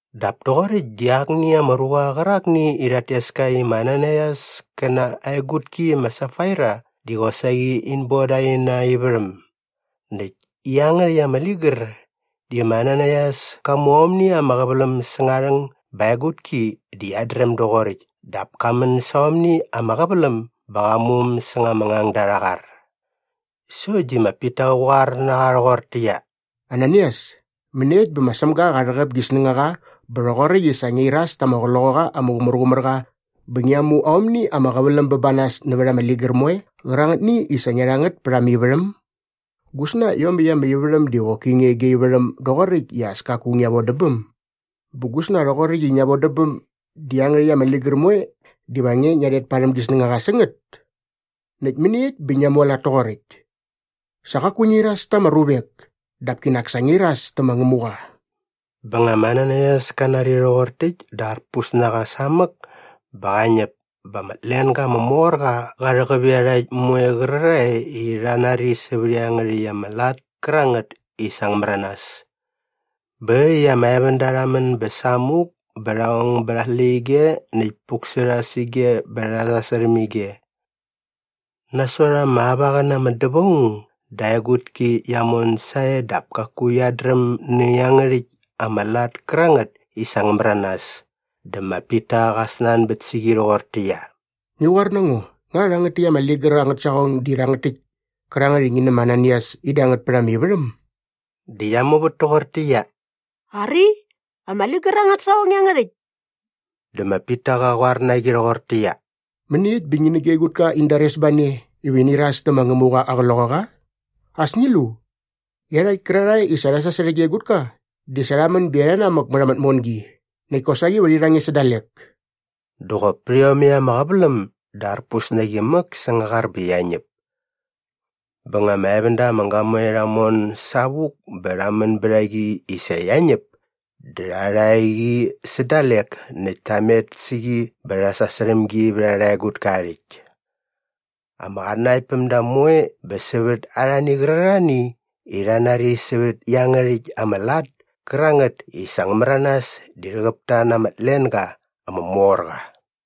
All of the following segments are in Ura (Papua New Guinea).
Dap toqoräkt di akni ama ruqa qärakni i rhat tes ka i ma Ananaias kä na aa egutki ma Safaira di qosaqi in boda aina ivärhäm. Näkt iangärhäkt ama ligär di ma Ananaias ka mu aomni ama qäväläm säng aa rhäng bä aa egutki di qiat dräm doqoräkt dap ka män sa aomni ama qäväläm bä qa mu äm säng ama ngangda arha qar. Sokt di ma Pita qä qoar na qa rhoqortäqyia, “Ananaias, mäniekt bä ma Sämga qa rhäqäp gi snängaqa bä rhoqoräkt di sa ngia iras ta ama Qloqaqa ama Qumärqumärqa bä ngia mu aomni ama qäväläm bä ba nas nävät ama ligär moe qärangätni i sa ngia rha ngät pät ama ivärhäm? Gusna iomäkt ama ivärhäm di qoki nge gia ivärhäm doqoräkt i as kaku ngia vodä bäm? Bä gusna rhoqoräkt i ngia vodä bäm di iangärhäkt ama ligär moe diva nge ngia rhet parhäm gi snängaqa sä ngät? Näkt mäniekt bä ngia mualat toqoräkt? Sa qaku ngia iras ta ama ruvek dap kinak sa ngia iras tä ma Ngämuqa.” Bä nga ma Ananaias ka nari rhoqor täkt dä arpus na qa samäk bä qa ñäp bä ama tlenga ama mor qa qa rhäqäp iarhakt moe qärarhae i rha nari sävät iangärhäkt ama lat kärangät i sa ngä märanas. Bä äkt i ama evända rha män bä samuk bä rha ong bät aa släqyige näkt puk sä rha sä ige bä rha sasärhäm ige. Nasot ama auaqäna ama dävaung dä aa egutki qia mon sae dap kaku qiat dräm nä iangärhäkt ama lat kärangät i sa ngä märanas. Dä ma Pita qa snanbät sä qi rhoqortäqyia, “Ngi qoar na ngo, nga rhangät täkt ama ligär angät saqong di rhangät täkt kärangät i ngi nä ma Ananaias in da ngät pät ama ivärhäm?” Dä qia muvät toqortäqyia, “Ari, ama ligär angät saqong iangärhäkt.” Dä ma Pita qa qoar na qi rhoqortäqyia, “Mäniekt bä ngi nä gia egutka in dares ba ne iva ini iras tä ma Ngämuqa aa Qloqaqa? As ngi lu! Iarhakt kärarhae i sa rha sasärhä gia egutka di sa rha män bä iarha namäk mät ama tmongi näkt kosaqi va rhi rha nge sä dalek.” Dä qop pät iomäkt ama qäväläm dä arpus na qi mäk säng aa qar bä qia ñäp. Bä nga ama evända ama gamoe rha mon savuk bä rha män bät a qi i sa qia ñäp dä rha rha qi sä dalek näkt ta met sä qi bä rha sasärhäm gi vät arha egutka aa rhäkt. Ama qatnanaktpämda moe bä sävät arhani qärarhani i rha nari sävät iangärhäkt ama lat kärangät i sa ngä märanas di rhäqäp ta na ama tlenga ama mor qa.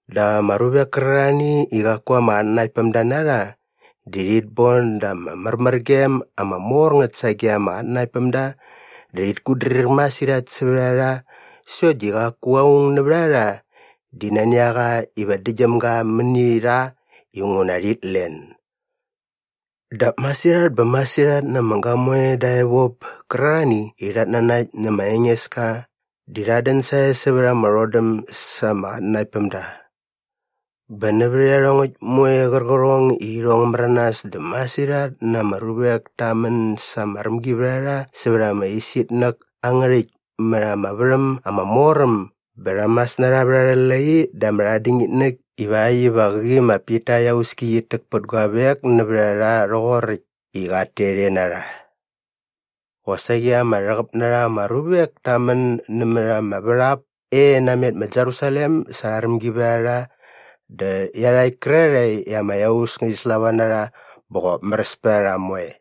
Dap ama ruvek kärarhani i qaku ama qatnanaktpämda na rha di rhit bon da ama märmärgem ama mor ngät sage ama qatnanaktpämda dä rhit kutdrir masirhat sävät a rha sokt di qaku aung nävät a rha di nani a qa iva däktgyäm ga mäni rha inguna rhit len. Dap masirhat bä masirhat na ama gamoe dä evop kärarhani i rhat nanakt nä ma Engeska di rhat dän sae sävät ama rhodäm sa ama qatnanaktpämda. Bä nävät iarhongäkt moe qärqärhong i irhong ngä märanas dä masirhat ama ruvek ta män sa ama rämgivärharha sävät ama isitnäk angä rhäkt mät ama värhäm ama mor äm bä rha mas na rha vät arhä lai dä ama rhatdingitnäk ivakt iva qäqi ma Pita aa iauski qit täk pät guavek nävät a rha rhoqoräkt i qat tet e na rha. Qosaqi ama rhäqäp na rha ama ruvek ta män nämät ama värhap e namet ma Jerusalem sa arha rämgivärharha dä iarhakt kärarhae i ama iaus ngärhi slava na rha bä qop märäs pät a rha moe.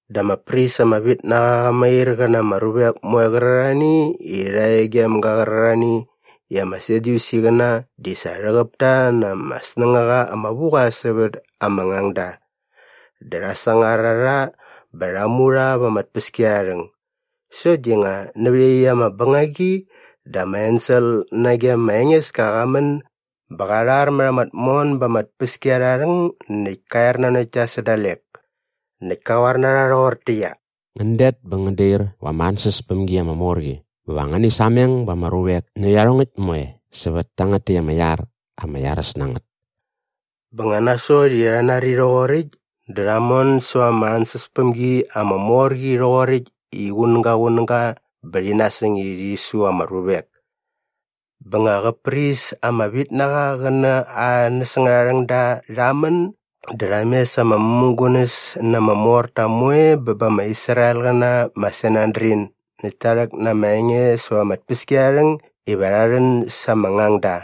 Dä ama pris ama vit na qa qa mair qä na ama ruvek moe qärarhani i rha e gem ga qärarhani i ama Sadyusiqäna di sa rhäqäp ta na ama snängaqa ama vu qa sävät ama ngangda. Dä rha sangar a rha bä rha mu rha va ama tpäskiarharhäng. Sokt di nga nävä iaqyäkt ama bängagi dä ama ensel nage ma Engeska qa män bä qa rhar mät ama tmon ba ama tpäskiarharhäng näkt ka er nanokt ta sä dalek. Näkt ka qoar na rha rhoqortäqyia, “Ngän det bä ngän dair va ama ansäspämgi ama mor qi bä va ngäni sameng ba ama ruvek nä iarhongäkt moe sävät tangät täkt ama iar ama iaräs na ngät.” Bä nga nasot i rha nari rhoqoräkt dä rha mon säva ama ansäspämgi ama mor qi rhoqoräkt i qunäga qunäga bä rhi nasäng i rhi su ama ruvek. Bä nga qä pris ama vit na qa qä na aa näsängarharhängda rha män dä rha mes ama mämugunäs na ama morta moe bä ba ama Israelqäna ma Sanedrin näkt ta rhäk na ama enge säva ama tpäskiarharhäng iva rha rhän sa ama ngangda.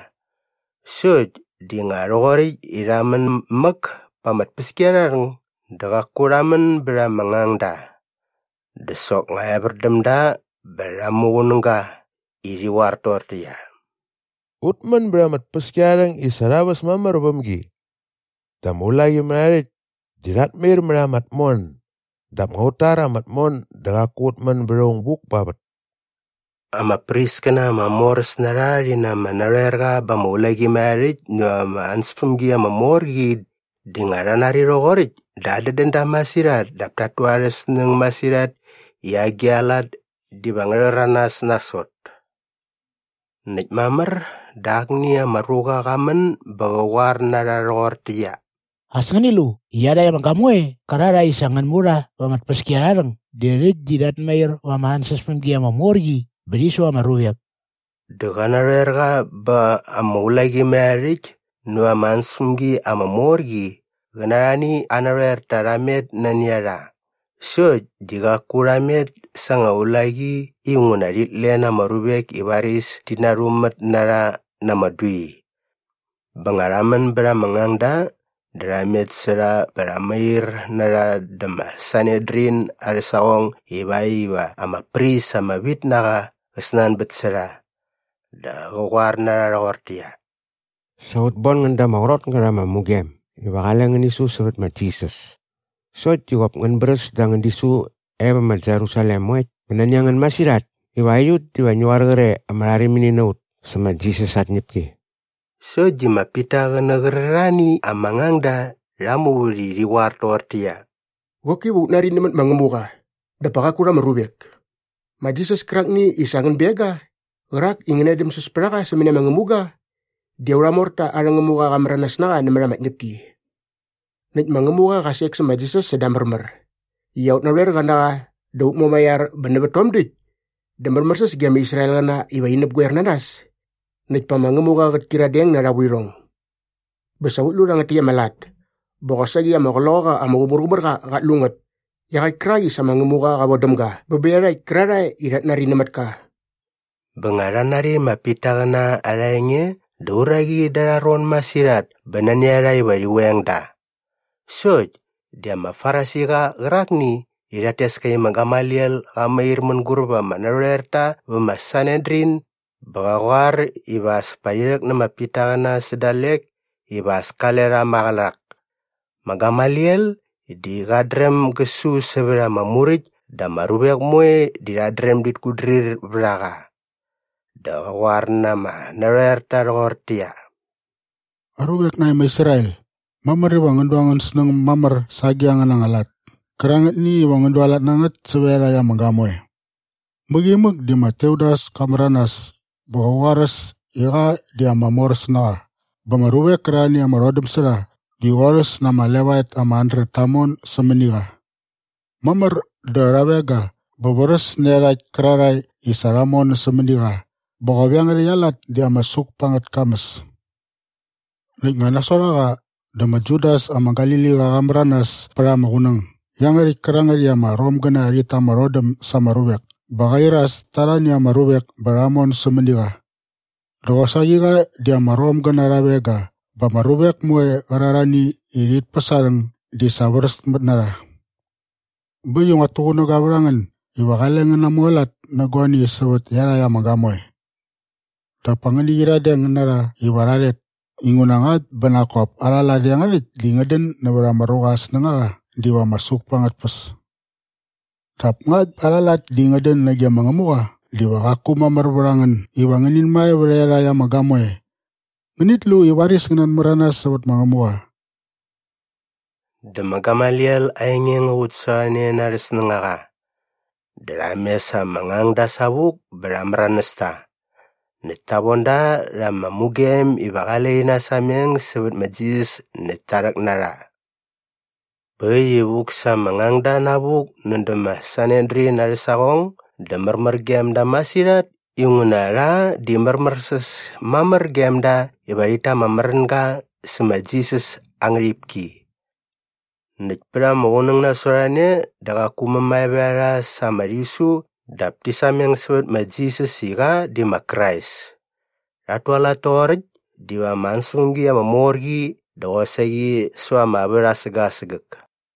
Sokt di nga rhoqoräkt i rha män mäk pa ama tpäskiarharhäng dä qaku rha män bät ama ngangda. Dä soknga evär däm da bä rha muqunäga i rhi qoar toqortäqyia, “Ut män bät ama tpäskiarharhäng i sa rha väs mamär väm gi dä ama ulaqimärharhärhäkt di rhat mair mät ama tmon dap nga ut tar ama tmon dä qaku ut män bät aung buk pa vät.” Ama priskäna ama moräs na rha rhi na ama narhoerqa ba ama ulaqimärharhärhäkt näva ama ansäspämgi ama mor qi di nga rha nari rhoqoräkt dä adädän da masirhat dap tat tu arhä snäng masirhat i agi a lat diva ngä rhäranas nasot. Näkt mamär dä akni ama ruqa qa män bä qä qoar na rha rhoqortäqyia, “As ngäni lu! Iarhakt ama gamoe qärarhae i sa ngän mu rha va ama tpäskiarharhäng di rhäkt di rhat mair va ama ansäspämgi ama mor qi bä rhi su ama ruvek.” Dä qä narhoerqa bä ama ulaqimärharhärhäkt näva ama ansäspämgi ama mor qi qä na arhani aa narhoerta rha met nani a rha. Sokt di qaku rha met sa anga ulaqi inguna rhit len ama ruvek i varis ti narhumät na rha na ama dui. Bä nga rha män bät ama ngangda dä rha met sä rha bä rha mair na rha dä ma Sanedrin arhä saqong ivakt iva ama pris ama vit na qa qä snanbät sä rha. Dä qä qoar na rha rhoqortäqyia, “Sa ut bon ngän da ama qrot ngät ama mugem iva qale ngäni su sävät ma Jisas. Sokt di qop ngän bräs da angän disu e vä ma Jerusalem moe bä nani a ngän masirhat iva aiut diva ngi qoar qre i ama rharimini na ut sä ma Jisas aa tñäpki.” Sokt di ma Pita qä nä qärarhani ama ngangda rha muvät i rhi qoar toqortäqyia, “Qoki va ut nari nämät ma Ngämuqa dap pa qaku rha ama ruvek. Ma Jisas kärakni i sa ngän beng ga qärak i ngäna edämsäs pät a qa sämäni ama ngämuga di aurha morta arhä Ngämuqa qa märanas na qa nämät ama tñäpki. Näkt ma Ngämuqa qa sek sä ma Jisas säda aa märmär i aut narhoerqa na qa dä aut Mumaiar bä nävät tom däkt dä märmärsäs ge ama Israelqäna iva rhit näpgoer na nas näkt pa ma Ngämuqa qät kyiradeng na arha vuirhong. Bä sa ut lu rhangät täkt ama lat bä qosaqi ama Qloqaqa ama Qumärqumärqa qat lu ngät iaqäkt kärak i sa ma Ngämuqa qa vodäm ga bä bä iarhakt kärarhae i rhat nari nämät ka.” Bä nga rha nari ma Pitaqäna arha enge dä uraqi da arha ron masirhat bä nani a rha iva rhi veng da. Sokt di ama Farisiqa qärakni i rhat tes ka i ma Gamaliel qa mair mänguräp ama narhoerta vä ma Sanedrin bä qa qoar iva as pa rhi rhäk nä ma Pitaqäna sä dalek iva as kale rha maqälak. Ma Gamaliel di qat dräm gä su sävät ama Muräkt dä ama ruvek moe di rhat dräm dit kutdrir vät a qa. Dä qä qoar na ama narhoerta rhoqortäqyia, “Aruvek nae ma Israel, mamär iva ngän du angän snäng mamär sa agi angäna lat kärangätni iva ngän dualat na ngät sävät iarhakt ama gamoe. Mäqi imäk di ma Teudas ka märanas bä qa qoaräs i qa di ama moräs na qa bä ama ruvek kärarhani i ama rhodäm sä rha di qorhäs na ama levaet ama handret ta mon sämäni qa. Mamär dä rha veng ga bä vräs nä iarhakt kärarhae i sa rha mon sämäni qa bä qop iangärhäkt aa lat di ama suk pa angät kamäs. “Näkt nga nasot a qa dä ma Judas ama Galiliqa qa märanas pät ama qunäng iangärhäkt kärangät i ama Romgäna rhit ta ama rhodäm sa ama ruvek bä qa iras ta arhani ama ruvek bä rha mon sämäni qa. Dä qosaqi qa di ama Romgäna rha veng ga bä ama ruvek moe qärarhani i rhit päs aa rhäng di sa vräsmät na rha. Bä äkt i nguat tuqunäga vät a ngän iva qale ngän namualat nä guani sävät iarhakt ama gamoe. Dap pa ngäni qyiradeng na rha iva rha rhet inguna ngakt bä nak kop arha lat iangärhäkt di ngät dän nävät ama ruqa aa snängaqa diva ama suk pa angät tpäs. Dap ngakt bä arha lat di ngät dän nage ma Ngämuqa diva qaku mamär vät a ngän iva ngänin mae vät iarhakt ama gamoe. Ngänit lu i varis ngän natmäranas sävät ma Ngämuqa!” Dä ma Gamaliel aa enge ngä qutsasorhane na arhä snängaqa. Dä rha mes ama ngangda savuk bä rha märanäs ta. Näkt ta von da rha ama mugem iva qale rhi nasameng sävät ma Jisas näkt ta rhäk na rha. Bä äkt i vuk sa ama ngangda navuk nädä ma Sanedrin arhä saqong dä märmär gem da masirhat inguna rha di märmärsäs mamär gem da iva rhit ta ama märänga sä ma Jisas aa ngärhipki. Näkt pät ama qunäng nasot a ne dä qaku mämae vät a rha sa ama rhisu dap ti sameng sävät ma Jisas i qa di ma Krais. Rhat tualat toqoräkt di va ama ansäspämgi ama mor qi dä qosaqi säva ama vät asägäk asägäk.